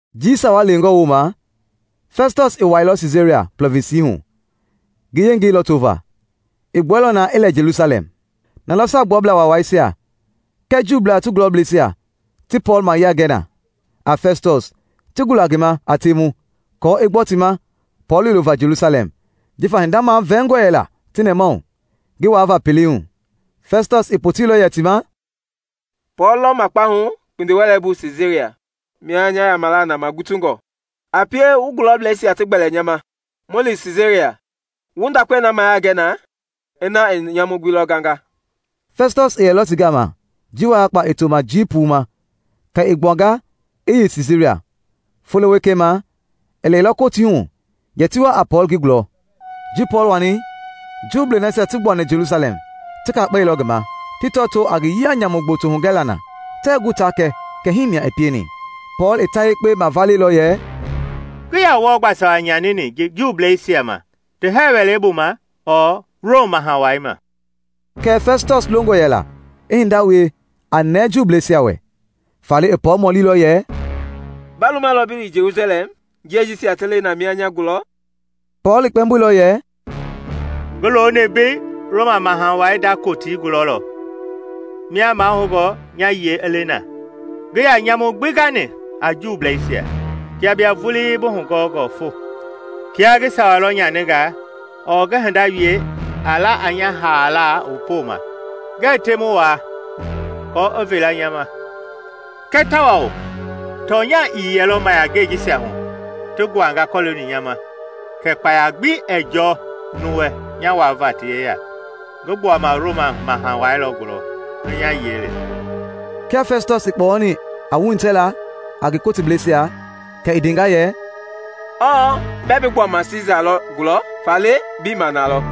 Jii sawa lewengɔ woma Fɛstɔs i wailɔ Siisaria plɔvinsi hu ngi yengei lɔto va, i gbueilɔ na i lɛ Jelusalɛm. Na lɔ Saagbuablaa Waawaisia kɛɛ Juublaa ti gulɔbleisia ti Pɔɔl mayiangɛi na a Fɛstɔs ti gula ngi ma a temu kɔɔ i gbɔ ti ma Pɔɔl yoyo va Jelusalɛm, jifa hinda mavɛɛngɔ yɛlɔ ti nɛmahu ngi waava pelei hu. Fɛstɔs i poteilɔ yɛ ti ma, “Pɔɔl lɔ makpahu kpindiwɛleibu Siisaria, mia nya yamala na magutungɔ. A pie wu gulɔbleisia ti gbɛli nya ma mu li Siisaria wu ndakpe na mayiangɛ na ina i nyamu gbi lɔ ganga.” Fɛstɔs i yɛlɔ ti gama jii wayakpa i to ma jii puu ma kɛ i gbuanga i yei Siisaria, folo wekei ma i lɛilɔ kotii hu yɛ ti wa a Pɔɔl ngi gulɔ. Ji Pɔɔl wani, Juublei nasia ti gbuani Jelusalɛm ti kakpɛilɔ ngi ma ti tɔtoo a ngi yia nyamu gboto hugɛla na tɛɛ gu ta kɛ kɛ himia i pieni. Pɔɔl i ta yekpe mavale lɔ yɛ, “Ngii yaa wɔɔ gbaa sawa nyanini Juubleisia ma, ti hɛɛ wɛleibu ma ɔɔ Rom Maha Wai ma.” Kɛɛ Fɛstɔs longɔ yɛla i hinda wie a nɛɛ Juubleisia wɛ, faale i Pɔɔl mɔli lɔ yɛ, “Ba lumalɔ bi li Jelusalɛm jie jisia ti le na mia nya gulɔ?” Pɔɔl i kpɛmboilɔ yɛ, “Ngi looni mbei Roma Maha wai nda kotii gulɔ lɔ mia mahoungɔ nya yiɛi i le na. Ngii yaa nyamu gbi gani a Juubleisia, kia bia vuii bi hugɔɔngɔ fo. Kiaa ngi sawa lɔ nyaninga ɔɔ ngi hinda wie a la a nya haala poma, ngɛɛ temu wuaa kɔɔ i veela nya ma. Kɛɛ tawao tɔnya ii yɛlɔ mayiangei jisia hu ti guanga kɔloongɔ nya ma, kɛ kpaya gbi ɛɛ jɔɔ nuu wɛ nya wuaava ti yeya. Ngi gbuama Roma Maha Wai lɔ gulɔ i nya yiɛi le.” Kia Fɛstɔs i kpɔyɔni a wuhitɛla a ngi kotilebleisia, kɛ i ndenga yɛ, “Ɔ bɛ bi gbuama Siisa lɔ gulɔ, faale bi ma nalɔ.”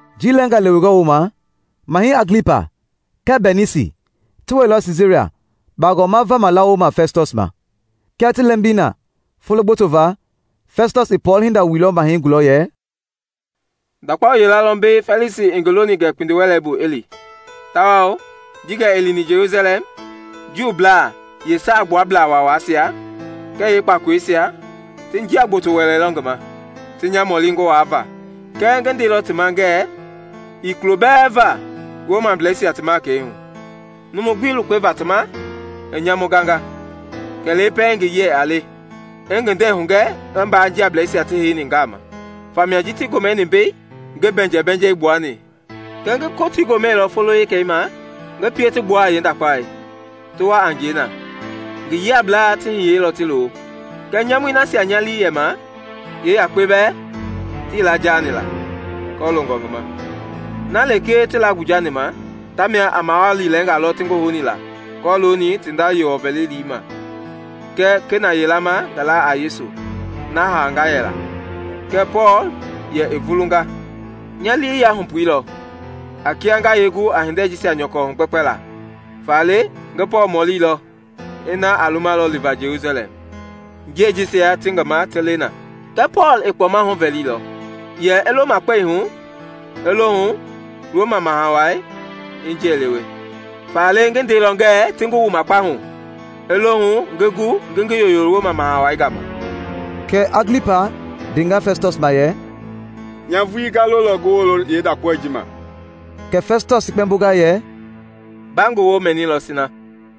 Jii lɛnga lewengɔ woma, Mahɛi Aglipa kɛɛ Bɛnisi ti wɛilɔ Siisaria bagɔma vama lawoma Fɛstɔs ma. Kia ti lɛmbi na folo gboto va, Fɛstɔs i Pɔɔl hinda wuilɔ Mahɛi gulɔ yɛ, “Ndakpao yila lɔ mbei Fɛlisi i ngi loni gɛ kpindiwɛleibu i li, tawao ji gɛ ngi lini Jelusalɛm, Juublaa yee Saagbuablaa Waawaisia kɛɛ yeekpakoloisia ti jia gboto wɛleilɔ ngi ma ti nya mɔli ngi waava. Kɛɛ ngi ndeilɔ ti ma ngɛ ii kulo bɛɛ va Romableisia ti makɛi hu numu gbi lukpe va ti ma i nyamu ganga kɛ lee pɛiŋ ngi yiɛi a le i ngi nde hugɛ ngi mbaa jiableisia ti heini gaama. Famia ji ti gomɛni mbei, ngii bɛɛbɛɛnjɛ gbuani, kɛɛ ngi kotii gomɛilɔ folo wekei ma ngi pie ti gbua a yeendakpaoi ti wa a ngie na. Ngi yiablaa ti hiyeilɔ ti loo, kɛɛ nyamui nasia nya lii yɛ ma yeeyakpe bɛɛ tii laa jaani la kɔloongɔ ngi ma. Na lekee ti laa gbuje ma tamia a mawali lɛnga lɔ ti ngi houni la kɔlooni ti nda Yewɔ vɛlile ma kɛɛ kena yila ma ngi laa a Yesu na haanga yɛla, kɛɛ Pɔɔl yɛ i vulunga. Nya lii yahupuilɔ a kia nga yeegu a hinde yee jisia nyɔkɔ hugbɛkpɛla, faale ngi Pɔɔl mɔlilɔ ina a lumalɔ liva Jelusalɛm jiei jisia ti ngi ma ti le na. Kɛɛ Pɔɔl i kpɔma huvɛilɔ; yɛ i lo makpɛi hu i lohu Roma Maha Wai i ngi yiɛi lewe. Faale ngi ndeilɔ ngɛ ti ngi wu makpahu i lohu ngi gu ngi ngi yoyo Roma Maha wai gama.” Kɛɛ Aglipa ndenga Fɛstɔs ma yɛ, “Nya vuii nga lolɔ ngi wolo yeendakpao ji ma.” Kɛ Fɛstɔs i kpɛmbonga yɛ, “Ba ngi wo mɛilɔ sina.”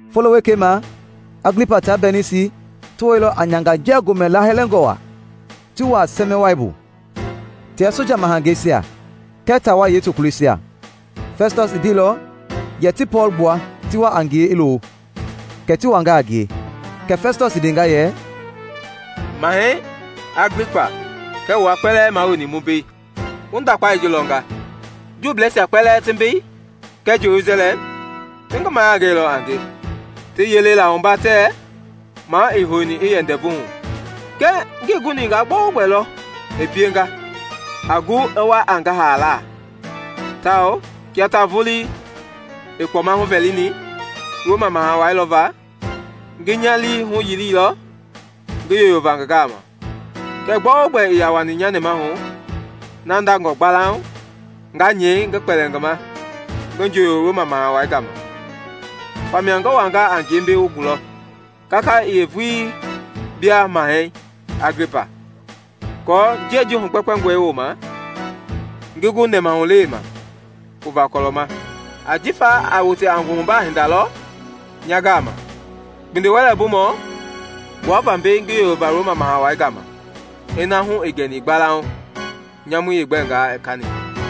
Folo wekei ma, Aglipa taa Bɛnisi ti wɛilɔ a nyanganjia gomɛ laahɛlɛngɔ wa ti wuaa sɛmɛwai bu tia soja mahangeisia kɛɛ taawai yeetokuloisia. Fɛstɔs i ndeilɔ yɛ ti Pɔɔl gbua ti wa a ngie i loo, kɛ ti wanga a ngie. Kɛ Fɛstɔs i ndenga yɛ, “Mahɛi Aglipa kɛɛ wua kpɛlɛɛ mua wueni mu mbei: Wu ndakpao ji lɔnga! Juubleisia kpɛlɛɛ ti mbei kɛɛ Jelusalɛm ti ngi mayiangɛilɔ a nge ti yele la wumba tɛɛ maa ii houni i yɛ ndɛvu hu. Kɛɛ ngii guni nga gbɛogbɛ lɔ i pienga a gu i wa a ngi haala. Tawao kia ta vuii i kpɔma huvɛlini Roma Maha Wai lɔva, ngi nya lii huyili lɔ ngi yoyo va ngi gama. Kɛɛ gbɛogbɛ ii yaa wani nya nɛmahu na ndangɔ gbalauŋ nga nyɛi ngi kpɛli ngi ma ngi jooyo Roma Maha Wai gama. Famia ngi wanga a ngie mbei wu gulɔ, kaka yee vuii bia Mahɛi Aglipa, aako jiei ji hugbɛkpɛngɔi woma, ngi gu nɛmahulewe ma pu va kɔlɔ ma. Ajifa a wote a nguhubaa hinda lɔ nya gama kpindiwɛlɛbumɔ gbuava mbei ngi yoyova Roma Maha Wai gama ina hu ii gɛni gbalauŋ nyamui yeegbɛngaa i kani.”